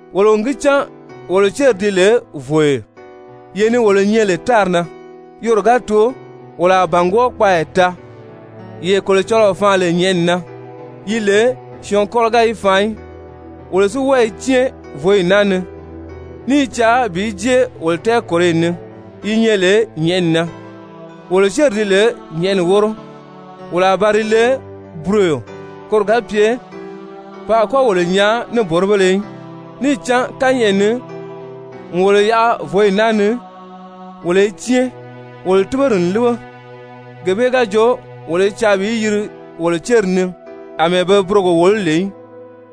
Wolo n gi cán wolo céri di lè vòyo, yee ni wolo nyɛ lè tári na, yoro ga too, wolo a bàngwɔɔ kpaaya taa, yee Kolocɔlɔɔ faan lè nyɛ̀ʔɛni na, yi lè syɔɔn kɔ́lɔ ga yi faan í. Wolo si wɔ́ɔ i cɛ́ɛn vǒyi naa ni, ní i caa bi jée wolo tɛɛkòroyi ni yi nyɛ lè nyɛ̀ʔɛni na. Wolo céri di lè nyɛ̀ʔɛni wóro, wolo a ba di le buroyo koro ga pye pe a kɔ́ wolo nyaa níboribéle í. Níì cán kányɛʔɛ na n wolo yaʔa vǒyi naa ni wolo i cɛ́ɛn, wolo túgori n líbe, gee bee ga jo wolo i caa bi yiri wolo céri ni àmɛɛ be burogo wòló lè í,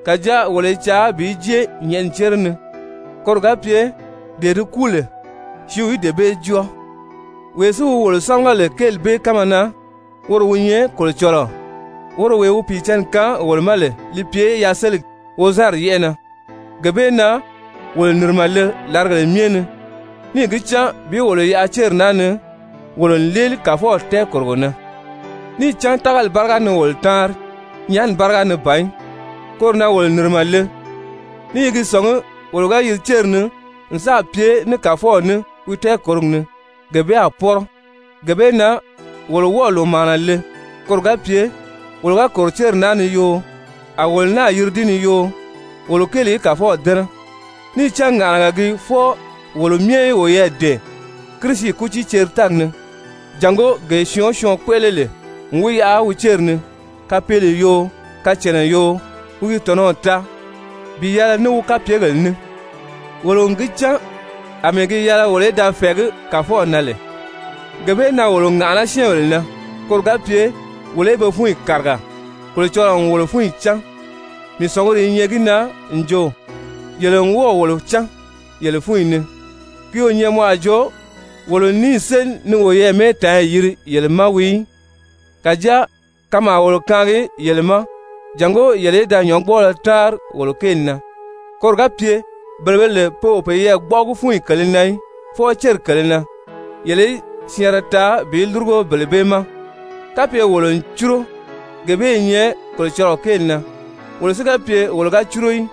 kàjáa wolo i caa bi jée nyɛ̀ʔɛni cére ni, koro ga pye dee di kúu lè, sìíw í dee bee jɔ́ɔ. Wee si wi wolo sámaga lè kéeli bee kánma na, woro wi nyɛ Kolocɔlɔɔ, woro wee wi Pìicǎnni kaan wolo ma lè li pye yaseligi wozanri yɛ́ʔɛ na. Gee bee na wolo nìrimɛ le làrigèle myɛ ni níì gi cán, bi wolo yaʔa céri naa ni wolo n léeli Kàfɔw tɛɛkòrogo na. Níì cán tágali báriga ni wolo táanri, nyaani báriga ni ban í. Koro na wolo nìrimɛ le ní i gi sɔ̀ngí wolo ga yiri céri ni n sáà pye ní Kàfɔw ní wi tɛɛkòrogi ni, gee bee a pɔ́rɔ. Gee bee na wolo wɔ́ɔ̀ lòmaana le, koro ga pye wolo ga kòro céri naa ni yoo, a wolo náà yiri di ni yoo, wolo kéeli í Kàfɔw dɛ́nɛ. Níì cán ŋàʔanaga gii fwɔɔ wolo myɛ í woyɛɛ dɛ̀ɛn Kirisi kútiiceri-tɛ́ɛgi ni, jàngó gee syɔɔn o syɔɔn kpéʔele lè n wi yaʔa wi céri ni, kapeele yoo, kacànna yoo, wi gi tɔ̀nɔw taa bi yɛlɛ ní wi kapyegèle ní. Wolo n gi cán àmɛɛ gi yɛlɛ wolo í da fɛ̀ɛgí Kàfɔw na lè, gee bee na wolo ŋàʔaná syɛ́ɛnbèle na koro ga pye wolo í be fúnyi kàriga. Kolocɔlɔɔ n wolo fúnyi cán, mii sɔ̀nguri i nyɛ gi na n jo yele n wɔ́ɔ̀ wolo cán yele fúnyi ni. Ki o nyɛ mɔ a jo wolo n níì séli ni woyɛɛ mɛ́ɛtaanyi yiri yele ma wii í. Kàjáa kanmaa wolo kaangi yele ma, jàngó yele í da nyɔ̌ngbɔɔlɔ táanri wolo kéeli na, koro ga pye bele be lè pe o peyɛɛ gbɔ́ʔɔgi fúnyi kèlē na í, fwɔɔ céri kèlē na, yele í syɛɛnrɛ taa bi lúrugo bele bee ma. Kapye wolo n cúro, gee bee i nyɛ Kolocɔlɔɔ kéeli na. Wolo si ga pye wo ga cúro í,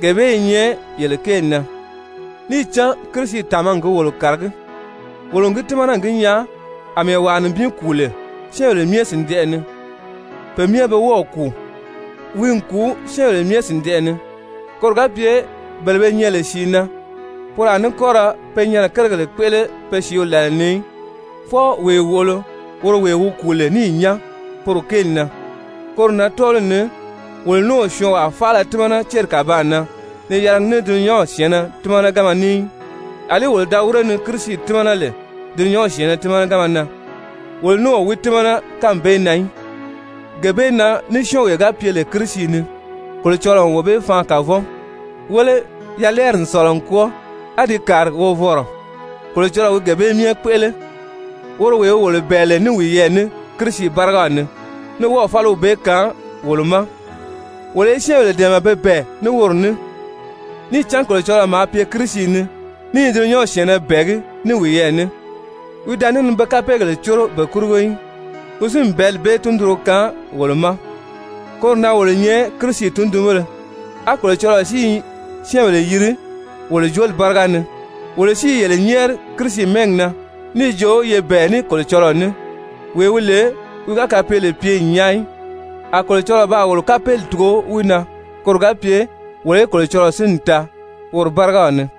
gee bee i nyɛ yele kéeli na. Níì cán Kirisi tàmagi gi wolo kàragí, wolo n gi tímana n gi nyaa, àmɛɛ wàa nibin kùu lè syɛ́ɛnbèle myɛ sìndɛʔɛ ni, pe myɛ be wɔ́ɔ̀ kùu. Wi n kùu syɛ́ɛnbèle myɛ sìndɛʔɛ ni, koro ga pye bele be nyɛ lè sìi na, poro a ní kɔ́ ra pe nyɛnɛ kérigèle kpéʔele be sìíw làla ni í, fwɔɔ wee wòʔolo, woro wee wi kùu lè níì nyán poro kéeli na. Koro na tɔ́ɔliw ni wolo ní o syɔɔnwaa faala tímana céri kàbaan na ni yɛlɛgi ní dulunyanw syɛ̀ɛnnɛ tímanaganma ní í. Alí wolo da wíre ni Kirisi tímana lè dulunyanw syɛ̀ɛnnɛ tímanaganma na, wolo ní o wi tímana kánmi bee na í. Gee bee na ní syɔ́ɔnwee ga pye lè Kirisi ni, Kolocɔlɔɔ n wee bee faan kavɔn. Wéle, yalɛɛri n sɔ̀lɔ n kwɔ́ɔ, á di kàri wovɔnrɔ. Kolocɔlɔɔ wi gee bee myɛ kpéʔele, woro wee wi wolo bɛ̀ɛ lè ní wiyɛɛ ní Kirisi bárigaw ni, ní wɔ́ɔ̀ fáliw bee kaan wolo ma wolo í syɛ́ɛnbèle dɛ̀ɛmɛ pe bɛ̀ɛ ní woro ní. Níì cán Kolocɔlɔɔ maa pye Kirisi ni, ní i dulunyanw syɛ̀ɛnnɛ bɛ̀ɛgí ní wiyɛɛ ní, wi da ní ni be kapeegèle córo be kurugo í, wi si n bɛ̀ɛ́li bee tundunro kaan wolo ma. Koro na wolo nyɛ Kirisi tundunbéle, á Kolocɔlɔɔ si i syɛ́ɛnbèle yiri wolo jooli báriga ni. Wolo si i yele nyɛ́ɛri Kirisi mɛ́ɛgi na níì jo ye bɛ̀ɛ ní Kolocɔlɔɔ ní! Wee wi lè wi ga kapeele pye n nyaa í, a Kolocɔlɔɔ baa wolo kapeeli tugo wi na, koro ga pye wolo í Kolocɔlɔɔ sínni taa woro bárigaw ni.